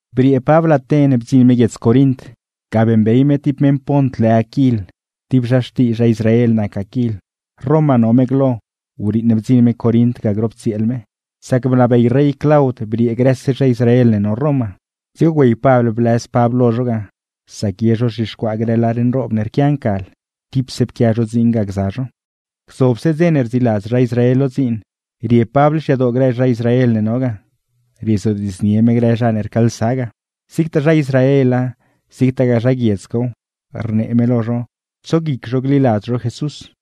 Briee Pabl Aten bdziṉ me guiedz Corint. Ga beeṉbey me ti meṉ Pont lë Aquil, ti zha xtii zha Israel nac Aquil. Roma no me glo, wriiṉ bdziṉ me Corint ga grop tsieel me; sac bnabey rey Claud briee grëse zha Israel ne no Roma. Dzigo güey Pabl blëz Pabl lo zho ga, sac ye zho rzhixcuaa grë lar nroob ne rquia ncal, tipse pquia zho dziin ga gza zho. Gzobse dze ne rdziiladz miech lo dziin rie Pabl xyadoo grë zha Israel ne no ga, riezodiidznie me grë zha ne rcaalsa ga; zigtaa zha Israela, zigtagaa zha guiedz cow rnee me lo zho tso guic zho gliladz zho Jesús.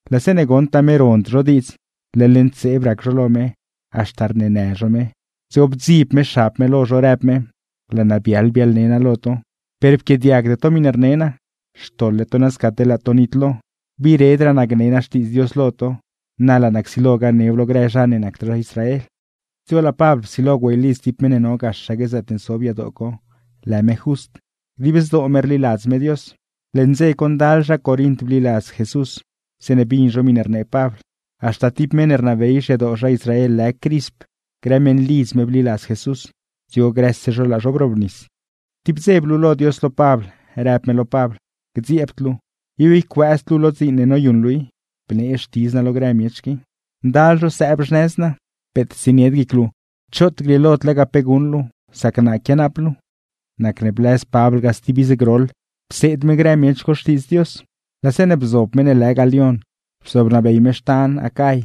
Laa zeeṉe goṉtaa me rond zho diidz, leḻ ntseeb rac zho lo me haxta rneenë zho Jesús, dzigo bdzib me xab me lo zho, rëb me: ―¡Laa naa biaḻ biaḻne naa lo to per pquiaadiagde to miṉe rne naa; xtoḻle to nasca teḻ laa to nitlo! Gbiiredraa naa gne naa Xtiidz Dios lo to, na laa naa csilo ganew lo grë zha ne nacd zha Israel. Dzigo laa Pabl psilo güey lidz ti meṉ ne no gaxaque zaatne zob yadoo co lë me Just, dib zdoo me rliladz me Dios. Leṉ dze co ndal zha Corint bliladz Jesús zeeṉe bin zho miṉe rnee Pabl, haxta ti meṉ ne rnabey xyadoo zha Israel lë Crisp, grë meṉlidz me bliladz Jesús, dzigo grëse zho laa zho brobnis. Ti wdze blulo Dios lo Pabl, rëb me lo Pabl: ―¡Gdziebd luu! ¡Ib ycuëëzd luu lo dziin ne noyuṉ luu i, bnee xtidz naa lo grë miech qui! Ndal grë miech rii no sëëb xnëz naa. Peet tsienied guic luu, choot grieelod lega pe guṉ luu sac naa quianaap luu. Nacne blëz Pabl ga stib iz groḻ, pseed me grë miech co Xtiidz Dios. Laa zeeṉe bzob meṉ ne lë Galión zobnabey me xtan Acay,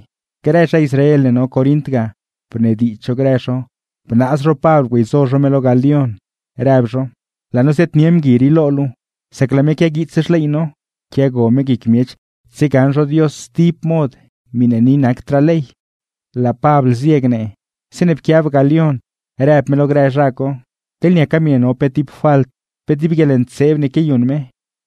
grë zha Israel ne no Corint ga bnediidz zho grë zho bnaaz zho Pabl güeyzo zho me lo Galión rëb zho: ―Laa no ziaadnie mgui rii lo luu, sac laa me quiaguiits xley no, quiago me guic miech tsiegaṉ zho Dios sti mod miṉe ni nacdraa ley. Laa Pabl zie gnee, zeeṉe pquiab Galión rëb me lo grë zha co: ―Teḻne niaca miṉe no pe ti falt, pe ti guieḻntseeb ne quiayuṉ me,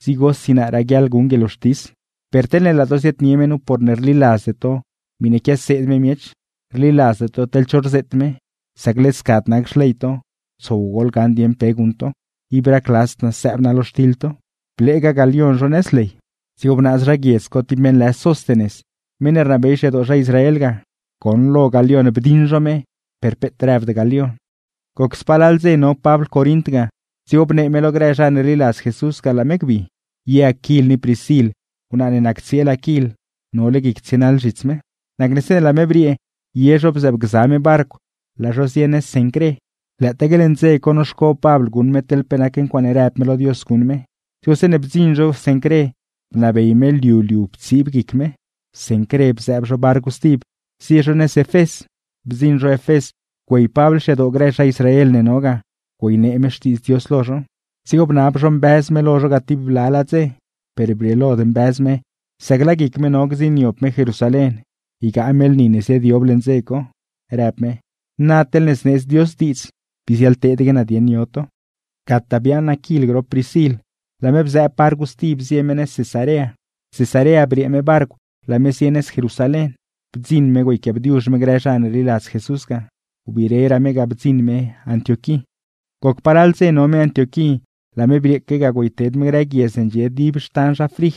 dzigosi naa raguiaḻ guṉ guieḻwxtis. Per teḻne laa to ziaadnie me nu porne rdziladzde to miṉe quiaseed me miech, rdziladzde to teḻ cho rzeet me, sac led scad nac xley to, tsow goḻgaṉ dieṉ pe guṉ to. Nodaque xtiḻ to guic naa. Bleega Galión zho nëz ley. Dzigo bnaaz zha guiedz co ti meṉ lë Sóstenes, meṉ ne rnabey xyadoo zha Israel ga; goṉlo Galión bdiṉ zho me, per peet rëbd Galión. Goc spalal dze no Pabl Corint ga, dzigo bnee me lo grë zha ne rliladz Jesús ga laa me gbi; ye Aquil ni Priscil wnaa ne nac tsieel Aquil nole guic tsienaḻ zhits me. Nacne zeeṉe laa me briee, ye zho bzëëbgza me barcw, laa zho zie nëz Cencré. Lëëtaaque leṉ dze co noxco Pabl guṉ me teḻ pe nac ncuaaṉe rëb me lo Dios guṉ me, dzigo zeeṉe bdziṉ zho Cencré bnabey me liu liu ptsiib guic me. Cencré bzëëb zho barcw stib, zie zho nëz Efés. Bdziṉ zho Efés, güey Pabl xyadoo grë zha Israel ne no ga güeynee me Xtiidz Dios lo zho. Dzigo bnab zho mbëz me lo zho ga ti blalaa dze, per brieelod mbëz me sac laa guic me no gdziṉniob me Jerusalén ygaa me lni ne ziaadyob leṉ dze co, rëb me: ―Na teḻne zneedz Dios diidz, bii ziaḻteedaque naa dieṉ yo to. Gataa biaaṉ Aquil grop Priscil, laa me bzëëb barcw stib zie me nëz Cesarea. Cesarea briee me barcw, laa me zie nëz Jerusalén. Bdziṉ me güeyquiaabdiuzh me grë zha ne rliladz Jesús ga; biireraa me ga bdziṉ me Antioquí. Goc palal dze no me Antioquí, laa me brieeque ga güeyted me grë guiedz ne ndxie dib xtan zha Frij,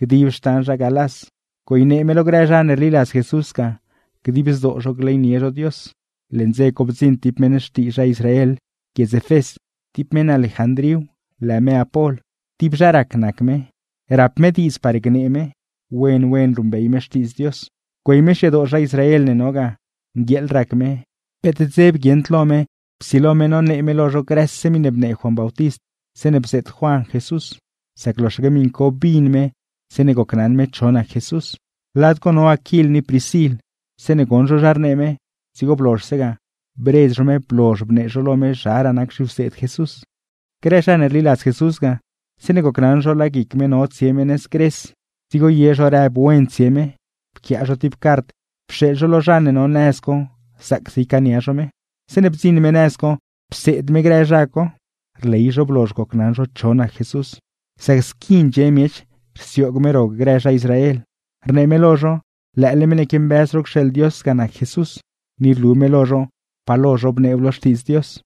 dib xtan zha Galás, güeynee me lo grë zha ne rliladz Jesús ga dib zdoo zho gleynie zho Dios. Leṉ dze co bdziṉ ti meṉ xtii zha Israel guiedz Efés, ti meṉ Alejandríw lë me Apol. Ti zha rac nac me, rieṉ me zha gnee me Xtiidz Dios lo miech. Güey me xyadoo zha Israel ne no ga, nguieeḻ rac me, peet dzeb guieṉd lo me psilo me nonee me lo zho grëse miṉe bnee Juan Bautist zeeṉe bzeet Juan Jesús; sac loxaque miṉ co bin me zeeṉe gocnaṉ me cho nac Jesús. Lad co co no Aquil ni Priscil, zeeṉe goṉ zho zha rnee me, dzigo blozhse ga, bredz zho me blozh bnee zho lo me zharaa nac zhiwseed Jesús. Grë zha ne rliladz Jesús ga, zeeṉe gocnaṉ zho laa guic me no tsie me nëz Gres, dzigo ye zho rëb wen tsie me, pquiaa zho ti cart pxeeḻ zho lo zha ne no nëz co zaacse ycaania zho me. Zeeṉe bdziṉ me nëz co, pseed me grë zha co. Rley zho blozh gocnaṉ zho cho nac Jesús; sac squi ndxie miech rsioog me ro grë zha Israel, rnee me lo zho lëële meṉ ne quiambëz zho cxeeḻ Dios ga nac Jesús, ni rlu me lo zho pa lo zhobneew lo Xtiidz Dios.